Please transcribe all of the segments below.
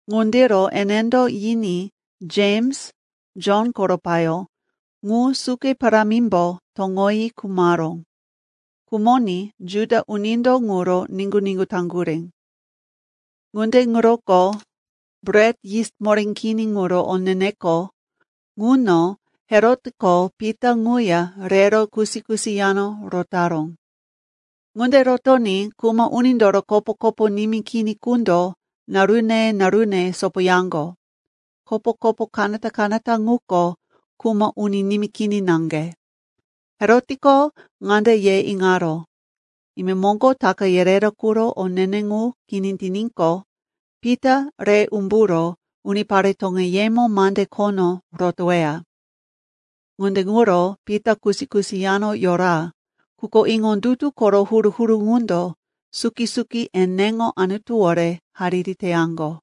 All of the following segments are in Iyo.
Ŋundiro enendo yiní Jems, Jon koro payó, ŋu suke parámimbo toŋoyi khumaró. Khumoní Juda unindo ŋuro niŋgu-niŋgu taŋgurí. Ŋunde ŋuroko Bret Yis Moré Kini ŋuro o ne-neko ŋuno Herotko Pita ŋuya rero kusi-kusi yano rotaró. Ŋunde rotoní kuma unindoro kopo-kopo nimí kini qundo narune-narune sopoyaŋgo. Kopo-kopo kanata-kanata ŋuko kuma uni nimí kini naŋge. Herotko ŋande ye iŋaró, imemoŋgo Taka yereró quro o ne-ne ŋu kini tiníqo, Pita re umburo unipare toŋeyemo mande khono rotoweya. Ŋunde ŋuro Pita kusi-kusi yano yora, quko iŋondutu koro huru-huru ŋundo suki-suki eneŋo Anutuwore hariri teyaŋgo.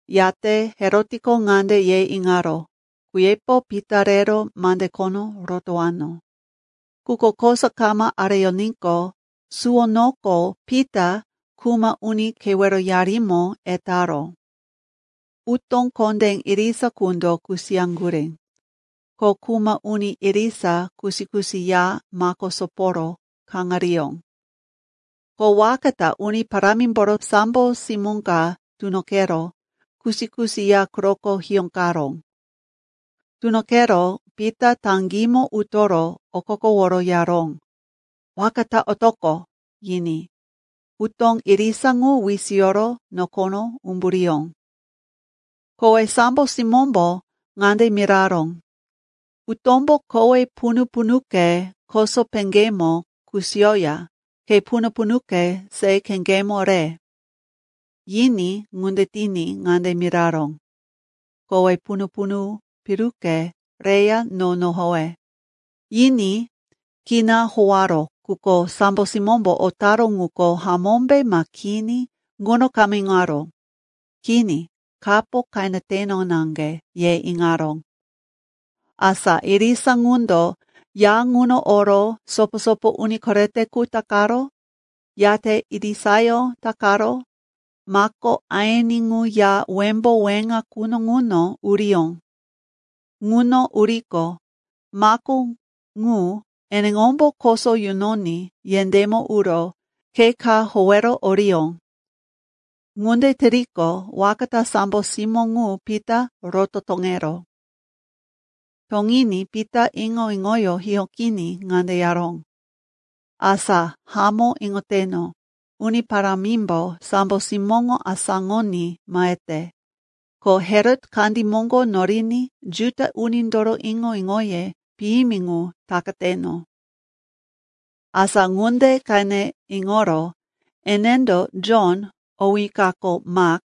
Yate Herotko ŋande ye iŋaró, kuyepo Pita rero mande khono rotowano. Quko kosa kama areyoníqo, suwonoko Pita kuma uni keweroyarimo etaró. Utó kondé irisa qundo kusiyaŋgurí, ko kuma uni irisa kusi-kusi ya mako soporo kaŋariyó. Ko waka ta Uni Parámimboro sambo simó ka tunoqero kusi-kusi ya quroko hiyóqaró. Tunoqero Pita taŋgímo utoro okokoworo yaró, “Waka ta otoqo,” yiní utó irisa ŋu wisiyoro nokono umburiyó. Kowe sambo simómbo ŋande miraró, “Utómbo kowe punu-punuke kosopeŋgemo kusiyoya khe punu-punuke se kheŋgemo re.” Yiní ŋunde tiní ŋande miraró, “Kowe punu-punu piruke reya no nohowe.” Yiní kina howaró, quko sambo simómbo o taró ŋuko hamómbe ma kini, ŋuro kama iŋaró. Kini, kapo qeneteno naŋge ye iŋaró. Asa irisa ŋundo ya ŋuno oro sopo-sopo uni korete qu takaro, yate irisayó takaro mako aini ŋu ya wembó weŋa quno ŋuno uriyó. Ŋuno uriqo, mako ŋu eneŋombo koso yunoní yendémo uro khe ka howero oriyó. Ŋunde tiriqo, waka ta sambo simó ŋu Pita roto toŋeró. Toŋiní Pita iŋo-iŋoyó hiyóqiní ŋande yaró, “Asa hamó iŋoteno, Uni Parámimbo sambo simóŋo asáŋoní mahete, ko Herot kandí moŋgo noriní Juda unindoro iŋo-iŋoye piyimi ŋu takateno.” Asa ŋunde qene iŋoro enendo Jon, owí kako Mak,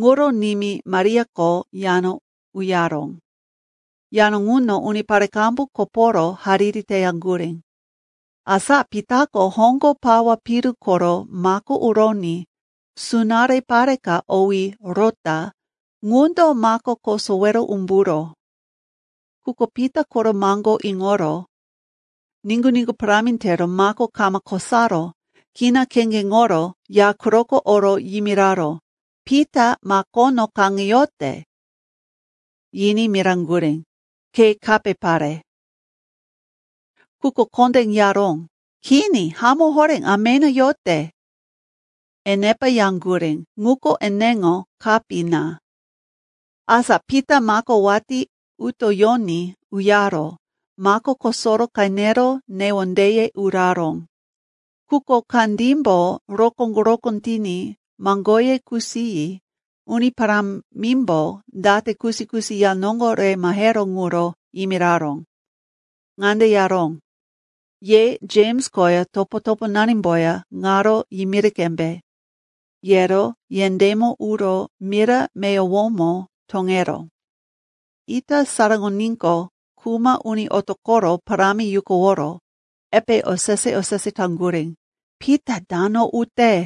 ŋuro nimí Mariako yano uyaró. Ya ŋuno unipare qambu koporo hariri teyaŋgurí. Asa Pitako hoŋgo pawa piru koro mako uroní sunará pare ka, owí Rota, ŋundo mako kosowero umburó. Quko Pita koro maŋgó iŋoro niŋgu-niŋgu parámi tero mako kama kosaró. Kina kheŋgeŋoro ya quroko oro yimiraró, “Pita makono kaŋeyote!” Yiní miraŋgurí, “Ke kape pare!” Quko kondé yaró, “Kini, hamó horé amena yote!” Enepa yaŋgurí, “Ŋuko eneŋo kapí na.” Asa Pita mako watí utoyoní uyaro mako kosoro qenero newondeye uraró. Quko kandímbo rokó-rokó tiní maŋgoye kusiyi Uni Parámimbo date kusi-kusi ya noŋgo re maheró ŋuro yimiraró. Ŋande yaró, “Ye Jems koya topo-toponanimboya ŋaro yimiri qembe,” yero yendémo uro mira meyowomo toŋeró. Ita saraŋoníqo, kuma uni otoqoro parámi yukuworo epe osese-osese taŋgurí, “Pita dano ute?”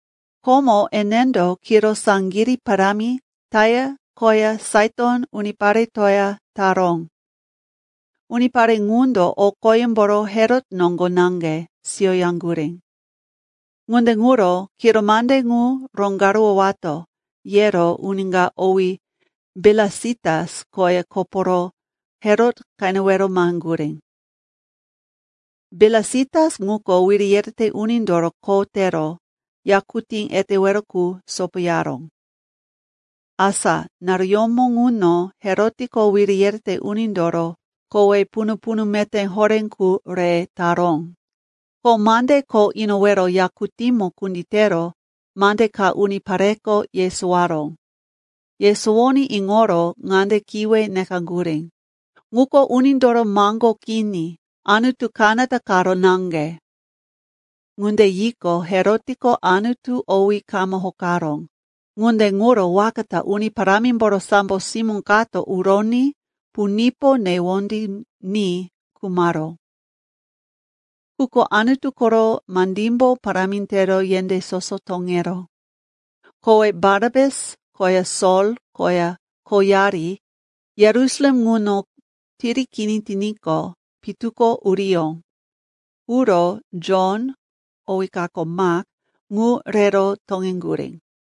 Komo enendo kiro saŋgirí parámi Tair koya Saiton uniparetoya taró. Unipare ŋundo o qoyemboro Herot noŋgo naŋge siyoyaŋgurí. Ŋunde ŋuro, kiro mande ŋu roŋgaruwowato, yero uni ka owí Bilasitas koya koporo Herot qenewero maheŋgurí. Bilasitas ŋuko wiri yerete unindoro kho tero yakutí etewero qu sopoyaró. Asa naruyómo ŋuno Herotko wiri yerete unindoro kowe punu-punu meté horé qu re taró, ko mande kho inowero yakutímo kunditero mande ka unipareko yesowaró. Yesowoní iŋoro ŋande kiwe nekaŋgurí, “Ŋuko unindoro maŋgó kini, anutu kanata karo naŋge!” Ŋunde yiqo, Herotko Anutu owí kama hokaró, ŋunde ŋuro waka ta Uni Parámimboro sambo simó kato uroní punipo newondí ni khumaró. Quko Anutu koro mandímbo parámi tero yendé soso toŋeró. Kowe Barnabas koya Sol koya khoyari Yerusalem ŋuno tiri kini tiníqo, pitu ko uriyó. Uro Jon, owí kako Mak, ŋu rero toŋeŋgurí.